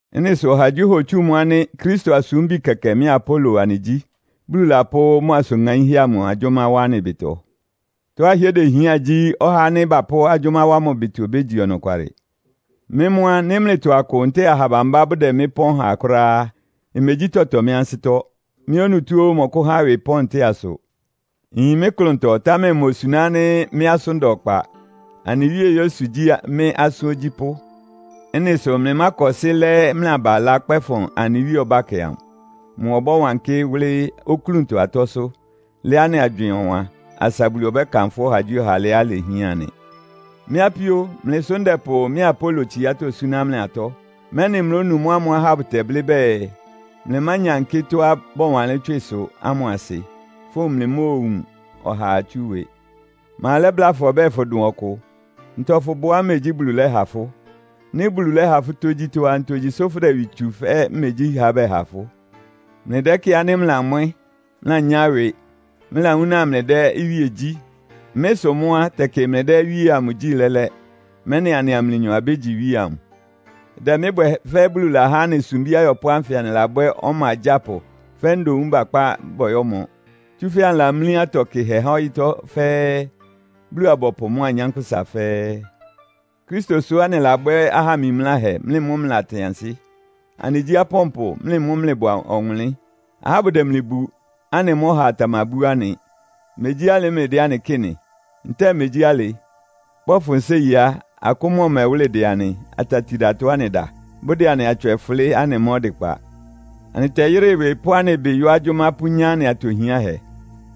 Ɩ́nɩ sʋ ɔhagyíɔha otsú mʋ́ ánɩ́ Kristo asúmbi kɛkɛ mɩ́a Apolo anɩgyí, Bulu lapʋ́ mʋ asʋn ŋaínhɛ́ amʋ agyʋ́má wá anɩ ɩbɩtɔ. Tɔ́á ɩhɩ́ɛ́ dehián gyí, ɔhá ánɩ́ bapʋ́ agyʋ́má wá mʋ ɩbɩtɔ obégyi ɔnɔkwalɩ. Mɩ́ mʋ́ á, nɩ́ mlɩtɔ akʋ ntɛ́ɛ aha bambá bʋdɛ mɩ́ pɔ́n ha kʋ́ráá á, imegyí tɔtɔ mɩ́ ansɩ́tɔ́. Mɩ́ onutó ó mmɔkʋ́há ɩwɩ pɔ́n ntɛ́ɛ asʋ. Nyin mɩ́ klʋntɔ, támɛ imosuná ánɩ́ mɩ́ asʋ́n da ɔkpa. Anɩ Wíe Yesu gyí mɩ́ asʋ́n ogyípʋ́. Ɩ́nɩ sʋ mlɩmákɔsɩ́ lɛ́ mlɩ aba ɩlá kpɛ́fʋn anɩ Wíe ɔbákɛ amʋ. Mʋ ɔbɔ́wankɩ́ wʋ́lɩ́ oklúntɔ atɔ́sʋ́, lɛ́ anɩ agywɩɩn ɔwan, asa Bulu ɔbɛ́kanfʋ́ ɔhagyíɔha alɩá ilehián nɩ. Mɩ́ apíó, mlɩ sʋ́ ndɛpʋ mɩ́a Apolo tsiátɔ́ súná mlɩ atɔ́, mɛ́nɩ mlónu mʋ́ ámʋ́ʋ́ ahá bʋtɛblɩ́ bɛɛ, “Mlɩmányankɩ́ tɔ́á bɔwanlɩ́n tswɩsʋ” ámʋ asɩ, fówun mlɩmóowun ɔhaa tsú ɩwɩ. Ma lɛ́bláa fʋ ɔbɛ́ɛ fʋdʋn ɔkʋ? Ntɔ fʋbʋá imegyí Bulu lɛ́ha fʋ́? Nɩ́ Bulu lɛ́ha fʋ́ tógyítɔ́ á, ntogyi sʋ́ fʋ́dɛ ɩwɩ tsu fɛ́ megyí ha bɛha fʋ́? Mlɩdɛ́kɩ́ɩ ánɩ́ mlɩlamwɛ́! Mlɩlanyá ɩwɩ! Mlɩlawúna mlɩdɛ́ iwíe gyí. Mɩ́ sʋ mʋ́ á, tɛkɩ mlɩdɛ́ iwíe amʋ gyí lɛ́lɛ́, mɛ́nɩ anɩa mlɩnyɔ abégyi iwíe amʋ. Ɩdɛ mɩ́ bwɛ fɛ́ Bulu lahá anɩ sumbí ayɔpʋ́ ánfɩ anɩlabwɛ́ ɔma agyápʋ fɛ́ ndoun bakpá bɔyɔ́mɔ. Tsúfɛ́ anɩlamlí atɔ kɩhɛ há ɔyɩ́tɔ́ fɛ́ɛ́, Bulu-abɔpʋ mʋ́a anyánkpʋ́sa fɛ́ɛ́. Kristo sʋ́ anɩlabwɛ́ aha mimláhɛ, mlɩ mʋ́ mlɩlatɩn ansɩ́. Anɩgyí apɔ́npʋ, mlɩ mʋ́ mlɩbʋ ɔwʋnlɩ́n. Ahá bʋdɛ mlɩ bu, anɩ mʋ́ ɔhaa tamabú anɩ. Megyí alɩ mlɩdɛ́ anɩ kɩ́ɩ nɩ? Ntɛ́ɛ megyí alɩ? Bɔ́fʋn séi á, akʋ́n mʋ́a ɔmɛwʋ́lɩ dɛ anɩ, atatidatɔ anɩda. Bʋdɛ anɩ atswɛ fʋlɩ́, anɩmá ɔdɩkpa. Anɩtɛyɩ́rɩ ɩwɩ pʋ́ anɩ ɩbɩ yɔ́ agyʋ́má pʋ́nyá anɩ atɔ hiánhɛ.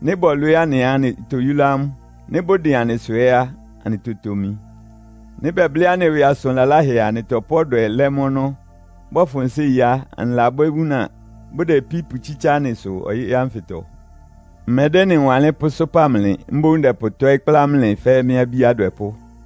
Nɩ́ bɔlwɩɩ́ anɩ á, anɩtoyúlá amʋ́. Nɩ́ bʋdɩn anɩsʋ ɛ́ á, anɩtotomi. Nɩ́ bɛblɩ́ anɩ ɩwɩ asʋn laláhɛ a, anɩtɔpʋ́ ɔdwɛ lɛ́ mʋ́ ɔnɔ́. Bɔfʋn séi á, anɩlabwɛ́ wúna, bʋdɛ ipí pʋtsítsá anɩsʋ ɔyɩ́ ánfɩtɔ. Mmɛdɛ́ ɩ́nɩ wanlɩ́n pʋ́sʋ́pa mlɩ, mboún ndɛpʋtɔ́ɩ́ kplá mlɩ fɛ́ mɩ́ abí adwɛpʋ́.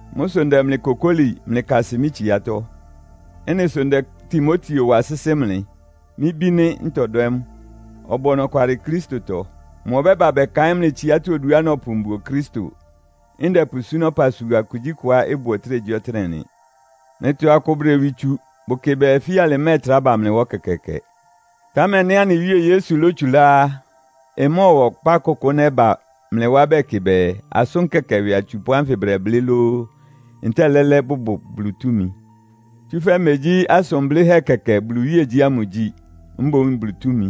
Mʋ́ sʋ ndɛ mlɩ kokóli, mlɩkasɩ mɩ́ tsiátɔ́. Ɩ́nɩ sʋ ndɛ Timoteo wa sɩ́sɩ́ mlɩ. Mɩ́ bí nɩ́, ntɔdwɛ́ mʋ. Ɔbʋ ɔnɔkwalɩ Kristotɔ. Mʋ ɔbɛ́ba bɛkaɩ́n mlɩ tsiátɔ́ oduá nɔpʋ mbuo Kristo, ndɛpʋsúná ɔpasua kugyíkʋá ɩbʋ ɔtɩ́nɛgyíɔtɩ́nɛ́ nɩ. Mlɩtɔ akʋ bʋdɛ ɩwɩ tsu. Bʋkɩ bɛɛ, fíalɩ mmɛ́ɛtrá ba mlɩ wá ɛkɛkɛɛkɛ. Támɛ nɩ́ anɩ Wíe Yesu lótsulá á, ɩmɔ́ɔwa ɔpá kʋkʋ nɛ́ba mlɩ wá bɛkɩ bɛɛ, asʋ́n kɛkɛ ɩwɩ atsupʋ́ ánfɩ bʋdɛblɩ́ lóó, ntɛ́ɛ lɛ́lɛ́ bʋbʋ Bulu túmi. Tsúfɛ́ megyí asʋn blɩ́hɛ́ kɛkɛ Bulu iwíegyí ámʋ igyi, mboún Bulu túmi.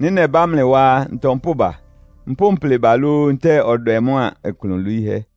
Nɩ́ nɛbá mlɩ wá á, ntɔ mpʋ́ba? Mpʋ́ mplɩ ba lóó, ntɛ́ɛ ɔdwɛ mʋ́a ɩklʋn lwiíhɛ́?